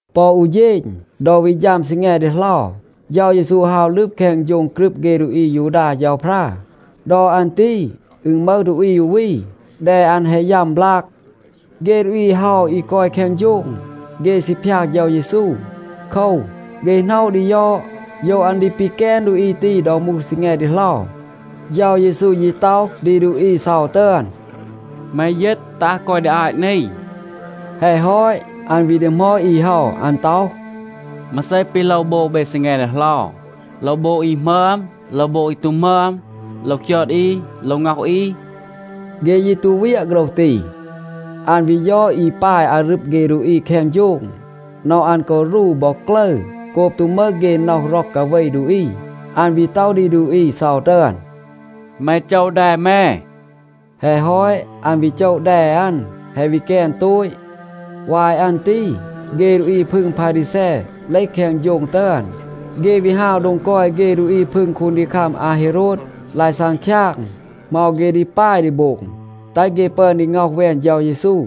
ปอ อู เฌณ, ดอ วี ฌัม ซีแง ดีเหลา เฌา เยซู ฮาว ลึบ แคง โฌง กรึบ เฆ ดูอี อายูดา เฌาพรา. ดอ อัน ตี อึณ มึห ดูอี อู วี, แด อัน แฮะ ยัม บลาก. เฆ ดูอี เฮา อี กอย แคง โฌง, เฆ ซี พยาก เฌา เยซู. โคว, เฆ หน็อะ ดี ยอด, โยว อัน ดี ปีแกน ดูอี ตี ดอ มูห ซีแง ดีเหลา. เฌา เยซู ยี ต็อห ดี ดูอี เซา ตึอน, “แม ยีต, ตัห กอย ดี อาต นี.” แฮะ ฮอต, อัน วี ดีหมอด อี เฮา, อัน ต็อห, “มาเซ ปี โลว โบง เบ ซีแง ดีเหลา? โลว โบง อี หมึอม, โลว โบง อี ตู หมึอม? โลว คยอด อี, โลว ง็อห อี?” เฆ ยี ตู เวียะ โฆรห ตี. อัน วี ยอด อี ปาย อารึบ เฆ ดูอี แคง โฌง, น็อห อัน กอ รู บอ กลึร โกบ ตู มึห เฆ น็อห ร็อก กาเว ดูอี. อัน วี ต็อห ดี ดูอี เซา ตึอน, “แม โจะ แด แม.” แฮะ ฮอต, อัน วี โจะ แด อัน. แฮะ วี แกน โตต. วาย อัน ตี เฆ ดูอี พึง พารีแซ เลห แคง โฌง ตึอน. เฆ วี ฮาว โดง กอย เฆ ดูอี พึง คูนดีคัม อาเฮโรด, ลาย ซังคยาง, เหมา เฆ ดี ปาย ดี โบง, แตห เฆ ปึอน ดี ง็อห แวน เฌา เยซู.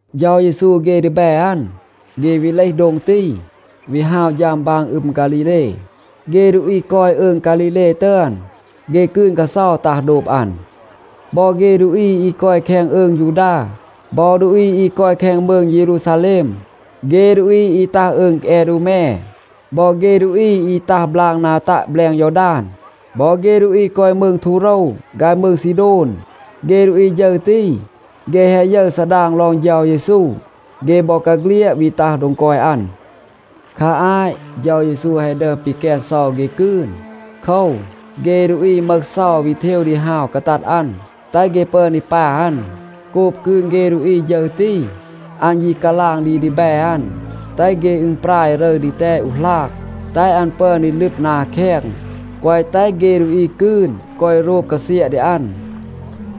เฌา เยซู เฆ ดีแบ อัน, เฆ วี เลห โดง ตี, วี ฮาว ฌัม บาง อึม ฆาลีเล. เฆ ดูอี กอย อืง ฆาลีเล ตึอน, เฆ กืน กาเซา ตัห โดบ อัน. บอ เฆ ดูอี อี กอย แคง อืง ยูดา, บอ ดูอี อี กอย แคง มืง เยรูซาแลม, เฆ ดูอี อี ตัห อืง แอดูแม, บอ เฆ ดูอี อี ตัห บลาก นา ตัะ แบลง ยอดาน, บอ เฆ ดูอี กอย มืง ทูโรว ฆาย มืง ซีโดน, เฆ ดูอี ฌึร ตี, เฆ แฮะ ยึร ซาดาง ลอง เฌา เยซู, เฆ บอกาเฆลียด วี ตัห โดง กอย อัน. คา อาต เฌา เยซู แฮะ ดึอม ปีแกน เซา เฆ กืน. โคว, เฆ ดูอี มึห เซา วี เทว ดี ฮาว กาตัด อัน, แตห เฆ ปึอน ดี ปา อัน. โกบ กืน เฆ ดูอี ฌึร ตี, อัน ยี กาลาง ดี ดีแบ อัน, แตห เฆ อึณปราย รึร ดีแตด อู หลาง, แตห อัน ปึอน ดี ลึบ นา แคง, แกวะ แตห เฆ ดูอี กืน กอย โรบ กาเซียะ ดี อัน.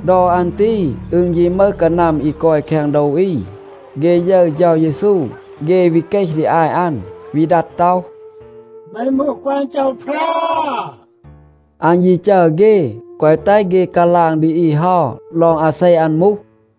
ดอ อัน ตี อึณ ยี มึห กานัม อี กอย แคง โดว อี. เฆ ยึร เฌา เยซู, เฆ วี เกห ดี อาต อัน, วี ดัด ต็อห, “แม มูห ฆอน เฌาพรา.” อัน ยี จัร เฆ, แกวะ แตห เฆ กาลาง ดี อี เฮา ลอง อาเซ อัน มูห.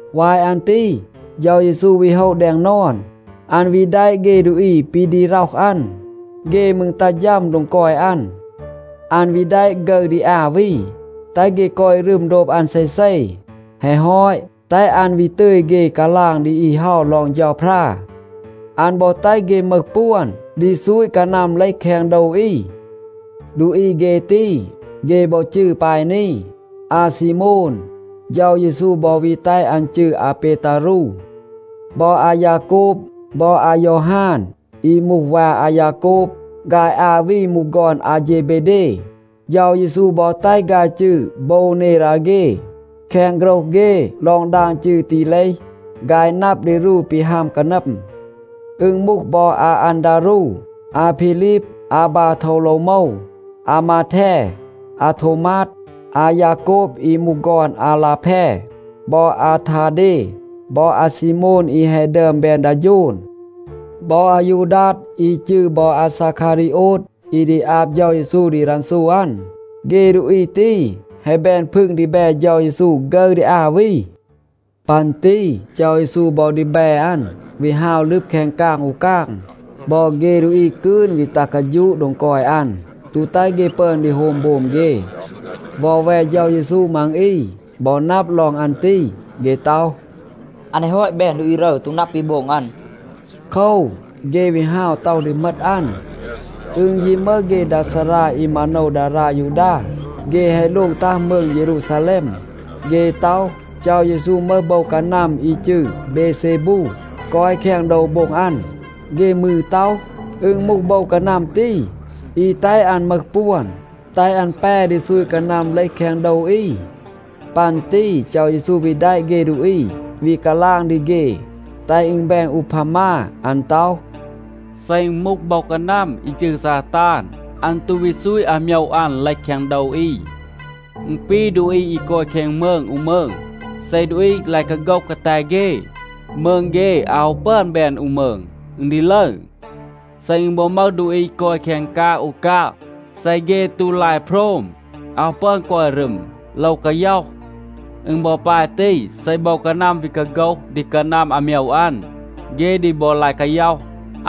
วาย อัน ตี เฌา เยซู วี โฮะ แดง นอน. อัน วี แดะ เฆ ดูอี ปี ดี ร็อห อัน. เฆ มืร ตัห ฌัม โดง กอย อัน. อัน วี แดะ ฆึร ดี อา วี, แตห เฆ กอย รึม โดบ อัน เซเซ. แฮะ ฮอต, แตห อัน วี ตึย เฆ กาลาง ดี อี เฮา ลอง เฌาพรา. อัน บอ แตห เฆ มึห ปวน ดี ซูต กานัม เลห แคง โดว อี. ดูอี เฆ ตี, เฆ บอ จืร ปาย นี. อาซีโมน, เฌา เยซู บอ วี แตห อัน จืร อาเปตารู. บอ อายาโกบ บอ อายอฮาน, อี มูห วา อายาโกบ. ฆาย อา วี มูห ฆอน อาเฌเบเด. เฌา เยซู บอ แตห ฆาย จืร โบวเนราเฆ. แคง โฆรห เฆ ลอง ดาง จืร ตี เลห, “ฆาย นับ ดี รู ปี ฮัม กานัม.” อึณ มูห บอ อาอันดารู, อาพีลีบ, อาบาโทวโลวโมว, อามาแท, อาโทวมาด, อายาโกบ อี มูห ฆอน อาลาแพ บอ อาทาเด บอ อาซีโมน อี แฮะ ดึอม แบน ดา โฌน บอ อายูดัด อี จืร บอ อาซาคารีโอด, อี ดี อาบ เฌา เยซู ดี รันซู อัน. เฆ ดูอี ตี แฮะ แบน พึง ดีแบ เฌา เยซู ฆึร ดี อา วี. ปัน ตี เฌา เยซู บอ ดีแบ อัน วี ฮาว ลึบ แคง กาง อู กาง. บอ เฆ ดูอี กืน วี ตัห กาฌูะ โดง กอย อัน, ตู แตห เฆ ปึอน ดี โฮม โบม เฆ. วอแว เฌา เยซู มัง อี บอ นับ ลอง อัน ตี, เฆ ต็อห, “อัน แฮะ ฮอต แบน ดูอี รึร, ตู นับ ปี โบง อัน.” โคว, เฆ วี ฮาว ต็อห ดี เหมต อัน. อึณ ยี มึห เฆ ดา ซารา อี มาโนว ดารา ยูดา. เฆ แฮะ โลง ตัห มืง เยรูซาแลม. เฆ ต็อห, เฌา เยซู มึห โบว กานัม อี จืร เบเซบูa กอย แคง โดว โบ็ง อัน. เฆ มืร ต็อห, อึณ มูห โบว กานัม ตี, อี แตห อัน มึห ปวน, แตห อัน แป ดี ซูต กานัม เลห แคง โดว อี. ปัน ตี เฌา เยซู วี แดะ เฆ ดูอี, วี กาลาง ดี เฆ, แตห อึณ แบน อูพามา. อัน ต็อห, “เซ อึณ มูห โบว กานัม อี จืร ซาตาน, อัน ตู วี ซูต อาโมยว อัน เลห แคง โดว อี. อึณ ปี ดูอี กอย แคง มืง อู มืง. เซ ดูอี ลาย กาโฆห กาแต เฆ, มืง เฆ อาว ฮู ปึอน แบน อู มืง. อึณ ดี ลึร. เซ อึณ บอ มึห ดูอี กอย แคง กาง อู กาง, เซ เฆ ตู ลาย โพรม, อาว ปึอน กอย รึม, โลว กาย็อห. อึณ บอ ปาย ตี, เซ โบว กานัม วี กาโฆห ดี กานัม อาโมยว อัน, เฆ ดี บอ ลาย กาย็อห.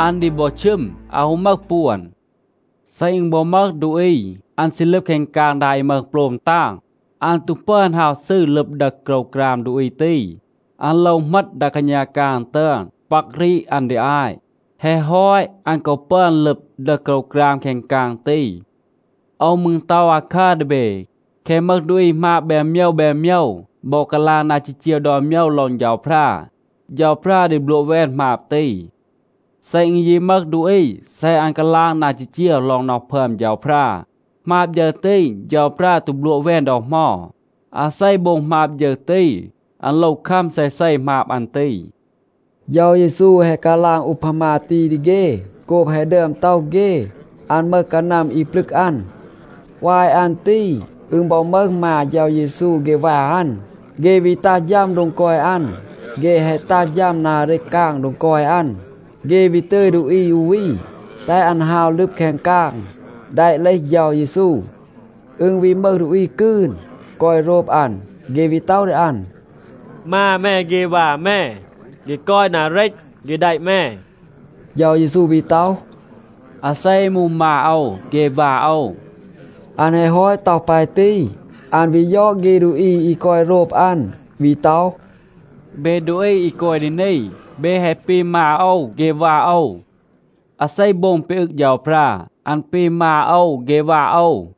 อัน ดี บอ ชึม. อาว ฮู มึห ปวน. เซ อึณ บอ มึห ดูอี, อัน ซี ลึบ แคง กาง ดา อี มึห โปลม ตาง, อัน ตู ปึอน ฮาว ซืร ลึบ ดึห โกรวกราม ดูอี ตี. อัน โลว เหมต ดา กาณา กาง ตึอน, ปัก รีด อัน ดี อาต. แฮะ ฮอต, อัน กอ ปึอน ลึบ, ดึห โกรวกราม แคง กาง ตี. โอว มืร ต็อห อาคัร ดี เบ. แคะ มึห ดูอี หมาบ แบน โมยว แบน โมยว, บอ กาลาง นา จีจีว ดอน โมยว ลอง เฌาพรา, เฌาพรา ดี บลัวะ แวน หมาบ ตี. เซ อึณ ยี มึห ดูอี, เซ อัน กาลาง นา จีจีว ลอง น็อห พึอม เฌาพรา, หมาบ ฌึร ตี, เฌาพรา ตู บลัวะ แวน ดอ เหมา. อาเซ โบง หมาบ ฌึร ตี, อัน โลว คัม เซเซ หมาบ อัน ตี.” เฌา เยซู แฮะ กาลาง อูพามา ตี ดี เฆ โกบ แฮะ ดึอม ต็อห เฆ, อัน มึห กานัม อี ปลึก อัน. วาย อัน ตี อึณ บอ มึห มา เฌา เยซู เฆ วา อัน, เฆ วี ตัห ฌัม โดง กอย อัน. เฆ แฮะ ตัห ฌัม นา เรต กาง โดง กอย อัน, เฆ วี ตึย ดูอี อู วี, แตห อัน ฮาว ลึบ แคง กาง, แดะ เลห เฌา เยซู. อึณ วี มึห ดูอี กืน, กอย โรบ อัน, เฆ วี ต็อห ดี อัน, “มา แม เฆ วา แม, เฆ กอย นา เรต, เฆ แดะ แม.” เฌา เยซู วี ต็อห, “อาเซ อี มูห มา โอว เฆ วา โอว?” อัน แฮะ ฮอต ต็อห ปาย ตี, อัน วี ยอด เฆ ดูอี อี กอย โรบ อัน, วี ต็อห, “เบ ดูอี อี กอย ดี นี, เบ แฮะ ปี มา โอว เฆ วา โอว. อาเซ โบง ปี อึง เฌาพรา, อัน ปี มา โอว เฆ วา โอว.”